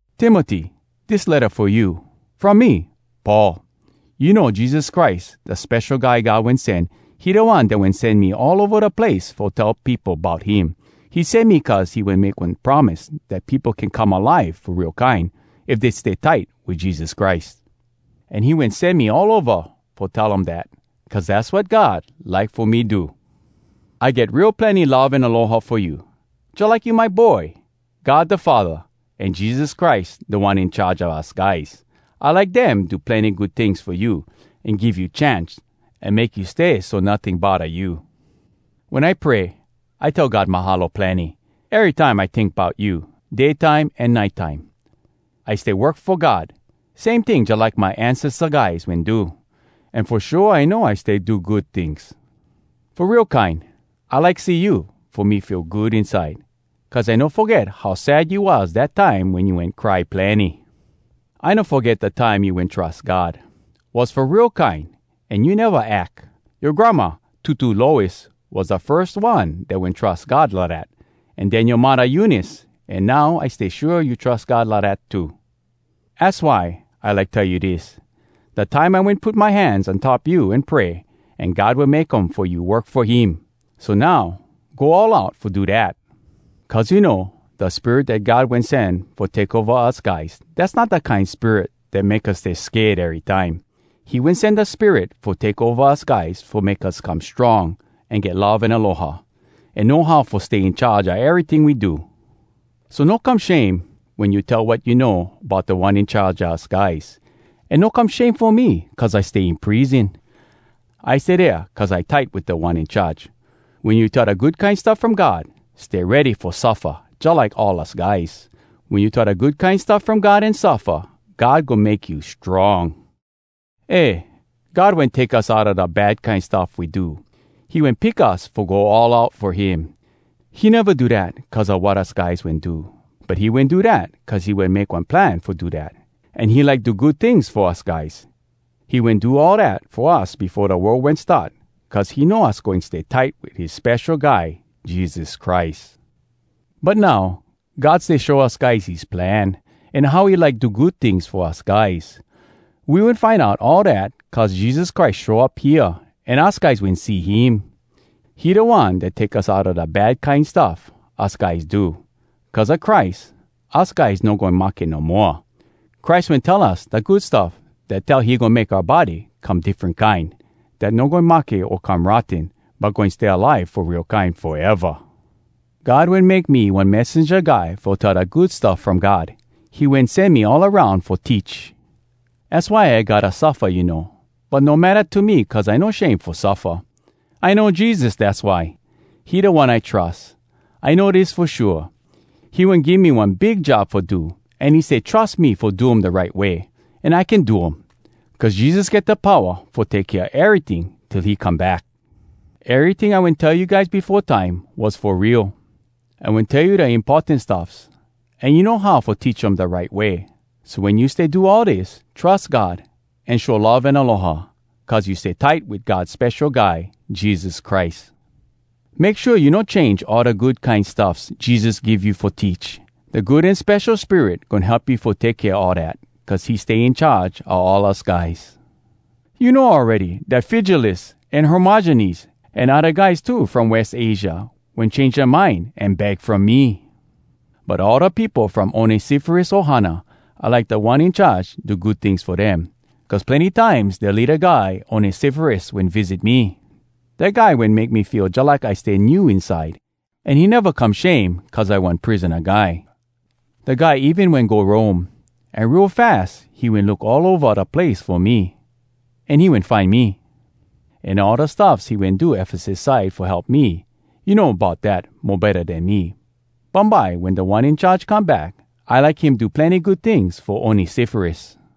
Timoty, dis letta fo you, from me, Paul. You know Jesus Christ, da Spesho Guy God Wen Sen—he da One dat wen sen me all ova da place fo tell peopo bout him. He sen me cuz he wen make one promise dat peopo can come alive fo real kine, if dey stay tight wit Jesus Christ. An he wen sen me all ova fo tell um dat, cuz dass wat God like fo me do. I get real plenny love an aloha fo you, jalike you my boy! God da Faddah, an Jesus Christ Da One In Charge a us guys, I like dem do plenny good tings fo you, an give you chance, an make you stay so notting bodda you. Wen I pray, I tell God “Mahalo plenny!” erytime I tink bout you, day time an nite time. I stay work fo God, same ting jalike my ancesta guys wen do. An fo shua I know I stay do good tings. Fo real kine, I like see you fo me feel good inside—cuz I no foget how sad you was dat time wen you wen cry plenny. I no foget dat time you wen trus God. Was fo real kine, an you neva ack. Yoa granma, Tutu Lois, was da firs one dat wen trus God lidat, an den yoa muddah Eunice, an now I stay shua you trus God lidat too. Az why I like tell you dis: Dat time I wen put my hands on top you an pray, an God wen make um fo you work fo him. So now, go all out fo do dat! Cuz you know, da Spirit dat God wen sen fo take ova us guys, dass not da kine Spirit dat make us stay sked erytime. He wen sen da Spirit fo take ova us guys fo make us come strong, an get love an aloha, an know how fo stay in charge a eryting we do. So no come shame wen you tell wat you know bout Da One In Charge a us guys! An no come shame fo me cuz I stay in prison. I stay dea cuz I tight wit Da One In Charge. Wen you tell da Good Kine Stuff From God, stay ready fo suffa jalike all us guys! Wen you tell da Good Kine Stuff From God an suffa, God goin make you strong! Eh! God wen take us outa da bad kine stuff we do. He wen pick us fo go all out fo him. He neva do dat cuz a wat us guys wen do, But he wen do dat cuz he wen make one plan fo do dat, An he like do good tings fo us guys. He wen do all dat fo us befo da world wen start, Cuz he know us goin stay tight Wit his Spesho Guy Jesus Christ. But now God stay show us guys his plan, An how he like do good tings fo us guys. We wen find out all dat Cuz Jesus Christ show up hea an us guys wen see him. He da One dat take us outa da bad kine stuff us guys do. Cuz a Christ, us guys no goin mahke no moa! Christ wen tell us da Good Stuff Dat tell he goin make oua body come diffren kine Dat no goin mahke o come rotten, But goin stay alive fo real kine foeva! God wen make me one messenja guy fo tell da Good Stuff From God. He wen sen me all aroun fo teach. Az why I gotta suffa, you know. But no matta to me cuz I no shame fo suffa! I know Jesus, dass why. He da One I trus. I know dis fo shua: he wen give me one big job fo do, an he stay trus me fo do um da right way. An I can do um! Cuz Jesus get da powa fo take kea eryting till he come back. Eryting I wen tell you guys befo time was fo real. I wen tell you da importan stuffs, an you know how fo teach um da right way. So wen you stay do all dis, trus God, an show love an aloha, cuz you stay tight wit God Spesho Guy Jesus Christ. Make shua you no change all da good kine stuffs Jesus give you fo teach. Da Good An Spesho Spirit goin help you fo take kea all dat, cuz he stay in charge a all us guys. You know awready, dat Fygelus, an Hermogenes, an odda guys too from West Asia, wen change dea mind an bag from me. But all da peopo from Onesiforus ohana, I like Da One In Charge do good tings fo dem. Cuz plenny times dea leada guy Onesiforus wen visit me. Dat guy wen make me feel jalike I stay new inside, an he neva come shame cuz I one prisona guy. Da guy even wen go Rome, an real fas he wen look all ova da place fo me, an he wen find me. An all da stuffs he wen do Efesus side fo help me, you know bout dat mo betta den me. Bumbye wen Da One In Charge come back, I like him do plenny good tings fo Onesiforus.